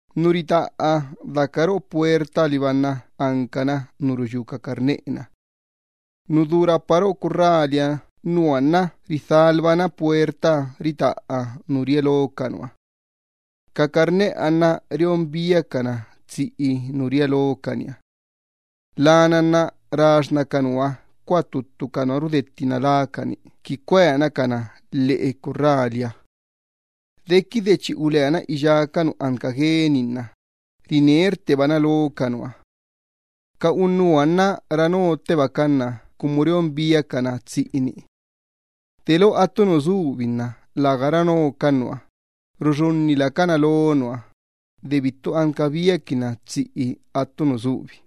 Nu ritaꞌa daca roꞌo puertaha liba nna ancana nu ruyú ca carneꞌe-na. Nu du rapa roꞌo curraliha nna nua nna ridhalbana puertaha ritaꞌa nu ria lo ca nua. Ca carneꞌeha nna reon biacana tsiꞌi nu ria locaniha. Lana nna raxxína ca nua coa ttuttu ca nua rudettina lácani qui cueancana lheꞌe curraliha. Dequide chi uleana iyá ca nu anca gueni nna rinerttebana lo ca nua. Ca unnuha nna ranottebacan na cumu reon biacana tsiꞌini. Delo attu nu subi nna läga ranocan nua, ruxunni lacana lo nua, de bittu anca biaquinna tsiꞌi attu nu subi.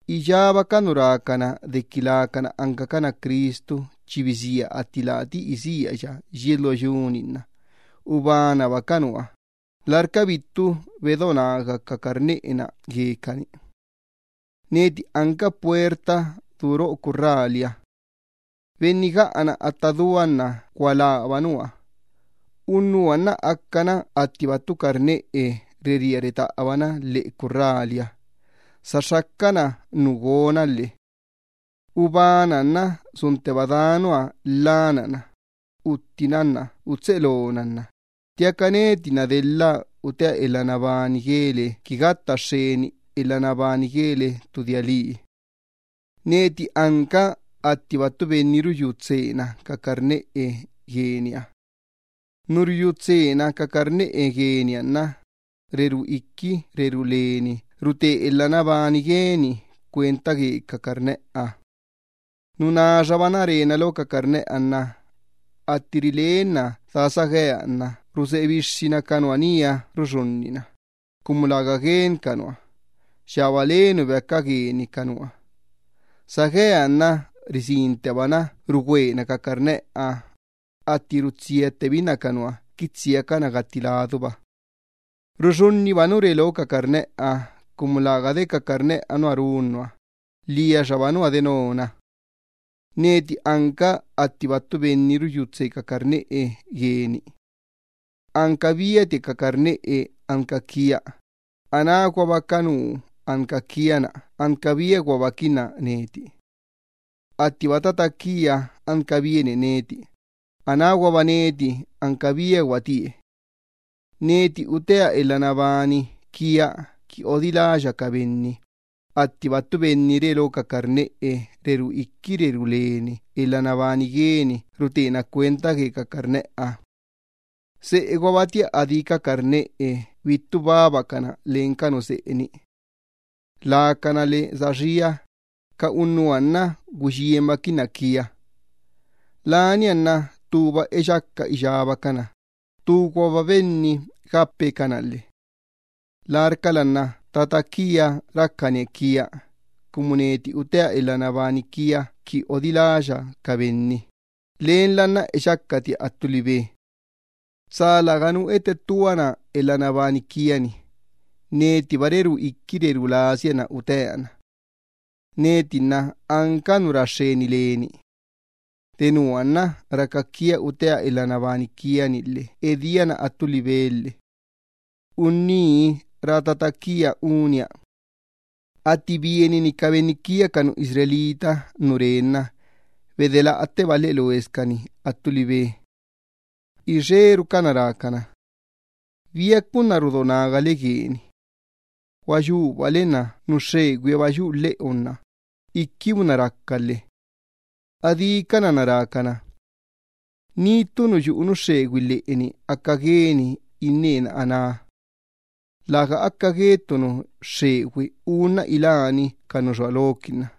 Iyába ca nu rácana dequi lacana ancacana Cristu chi bisía atti lati isíaya yies lo yu-ni nna ubanaba ca nua, larca bittu bedo naga ca carneꞌe-na guecani. Neti anca puerta du roꞌo curraliha. Benni gaꞌana atta dua nna gualába nua. Unnuha nna acana attiba ttu carneꞌe rería retaꞌabana lheꞌe curraliha, saxxacana nu gona lhe. ’Ubanaha nna suntteba daa nua lhanana, uttina lhe utseꞌe lona lhe ttiaca neti nna delha utea elha nabani guele qui gatta xxeni elha nabani guele ttu dia lii. Neti anca attiba ttu benni ruyú tseena ca carneꞌe gueniha. Nu ruyú tseena ca carneꞌe gueniha nna rerú iqui rerú leni rute elha nabani gueni cuenta gue ca carneꞌeha. Nu naxabana rena lo ca carneꞌeha nna atti rilenna daa sagueha nna ruseꞌe bixxina ca nua nía ruxunnina, cumu läga gueni ca nua, yaba le nu beaca gueni ca nua. Sagueha nna risinttebana rudaxxuna ca carneꞌeha, atti rutsiattebinna ca nua qui tsiacana gatti laduba. Ruxunniba nu re lo ca carneꞌeha cumu läga de ca carneꞌeha nua run nua, lhiaxaba nua denona. ’Neti anca attiba ttu benni ruyú tsee ca carneꞌe gueni. Anca biatia ca carneꞌe anca quia, anáguaba ca nu anca quia nna anca biaguabaquinna neti. Attiba tata quia anca bienie neti, anáguaba neti anca biaguatie. Neti utea elha nabani quia qui odiláya ca benni, attiba ttu benni re lo ca carneꞌe rerú iqui rerú leni elha nabani gueni rutena cuenta gue ca carneꞌeha. Seꞌe guabatia adí ca carneꞌe bittu babacana len ca nu seꞌe-ni. Lacana lhe saxía, ca unnuha nna güiyienbaquinna quia. Lania nna ttuba eyaca iyábacana, ttu guaba benni gape cana lhe. ’Larcala nna tata quia racanie quia, cumu neti utea elha nabani quia qui odiláya ca benni, lenla nna eyacatia attu libe. Tsa läganu ettettuana elha nabani quia-ni, netiba rerú iqui rerú lasia na utea na. Neti nna anca nu ra xxeni leni. Denua nna raca quia utea elha nabani quia-ni lhe edía na attu libe lhe. Unní rá tata quia unia. Atti bienini ca benni Israel nu rá Benniha nna bedelaꞌatteba lheꞌe loesicani attu libe. Ixerucana rácana: —¿Biaca unná rudo nagale gueni? Gua yubale nna nu xxegüihaba yuꞌu lheꞌonna iquibunna raca lhe. Adícana nna rácana: —Tsa läganu nu yuꞌu nu xxegüi lheꞌeni te aca gueni innena aná. Läga aca gue ttu nu xxegüi unna iláni ca nu xua loquinna.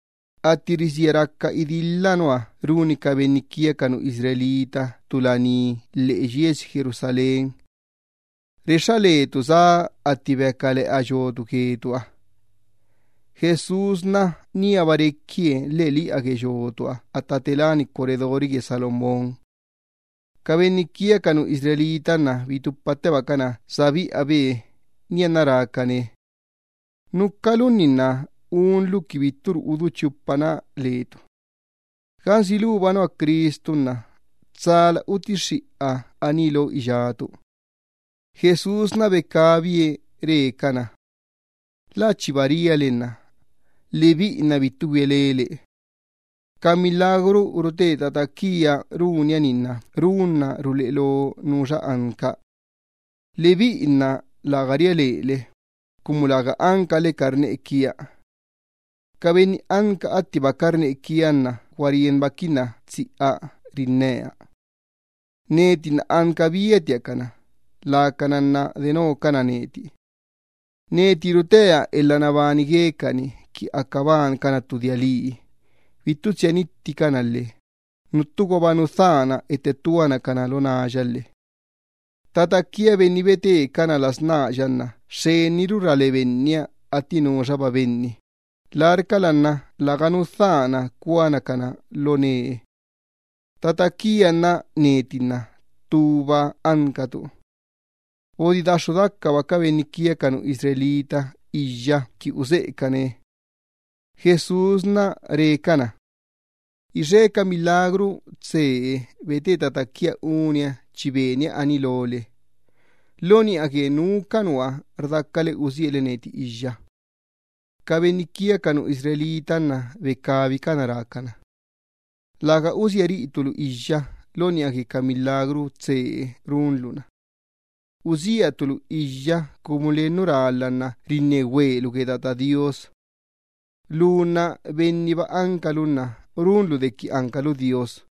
Atti risía raca idilhaha nua runi ca benni Israel ttu laní lheꞌe yiesi Jerusalén. Lania nua rexxa lecani la sá atti beaca leꞌa yotu guecaniha. Jesús níaba requie lheꞌeliꞌa gue yotuha atta te láni corredori gue Salomón. Ca benni Israel nna bitupattebacana sa biꞌabe, nianna rácane: —¿Núcalunni nna unlu qui bitturu udú chupana letu? Gansi luba nua Cristu, tsala utixxiꞌa aní lo iyátu. Jesús becabie re cana: —Lä chiba ria le nna lebiꞌi nna bittu güia lele. Ca milagru rute tata quia runia-ni nna ruleꞌe loque nuxa anca. Lebiꞌi nna läga ria lele, cumu läga ancale carneꞌe quia. Ca benni anca attiba carneꞌe quia nna gua rienbaquinna tsiꞌa rinnea. Neti nna anca biatia cana, lacana nna denocana neti. Neti rutea elha nabani guecani qui aca bancana ttu dia lii, bittu tsia nitticana lhe nuttuguaba nu dhana ettattuana cana lo náya lhe. Tata quia Benni betecana las náya nna xxeniru ra le Benniha atti nuxaba benni, larcala nna läganu dhana cuana cana lo nee. Tata quia nna neti nna ttuba ancatu. Bodidaxxu dacaba ca benni Israel iyya qui useꞌecane. Jesús re cana: —Ixe ca milagru tsee bete tata quia unia chi benia aní lole. ¿Lo niꞌa gue nu ca nua rdacale usiale neti iyya? Ca benni Israel nna becabicana rácana: —Läga usia riꞌitu lu iyya lo niꞌa gue ca milagru tsee runlu-na. Usiatu lu iyya cumu len nu rálha nna rinne güelu gue Tata Do Iyyabaaha. Lu nna benniba ancalu nna runlu dequi ancalu Dios.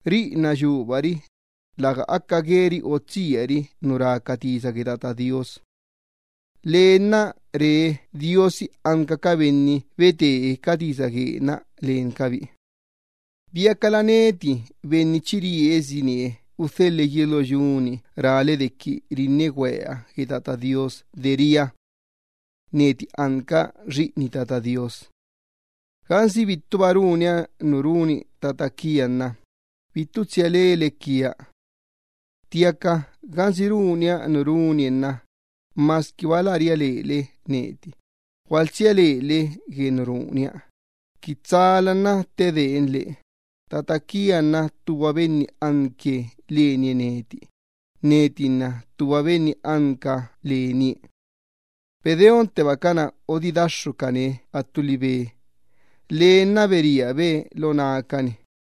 Riꞌi nna yubari, läga aca gueri otsiari nu rá ca tisa gue Tata Do Iyyabaaha. Lee nna re diosi anca ca benni betee ca tisa guee-na lencabi. ¿Biacala neti Benni chi riesinie udhelhe yies lo yu-ni rále dequi rinne güea gue Tata Do Iyyabaaha de ria: “Neti anca Xiꞌini Tata Do Iyyabaaha”? Gansi bittuba runia nu runi tata quia nna bittu tsia lele quia. Ttiaca gansi runba nu runie nna masquiba lä ria lele neti, gualtsia lele gue nu runia, qui tsala nna ttedeenle, tata quia nna ttuba Benni anque lenie neti, neti nna ttuba Benni anca lenie. Bedeonttebacana odidaxxucane attu libe, ttiaca lee nna ulabe lo nácani.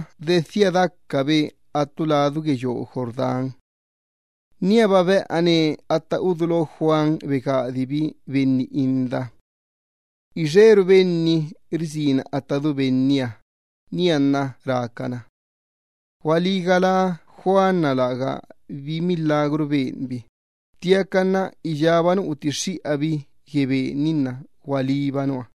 Dedhia dacaba Jesús attu ladu gue yoo Jordán. Níaba beꞌane atta udulo Juan begadibi benni inda. Ixeru benni risina atta du Benniha, nianna rácana: —Gualí galá, lägabi milagru beni Juan, ttiaca iyába nu utixxiꞌabi gue Ben-ni nna gualíba nua.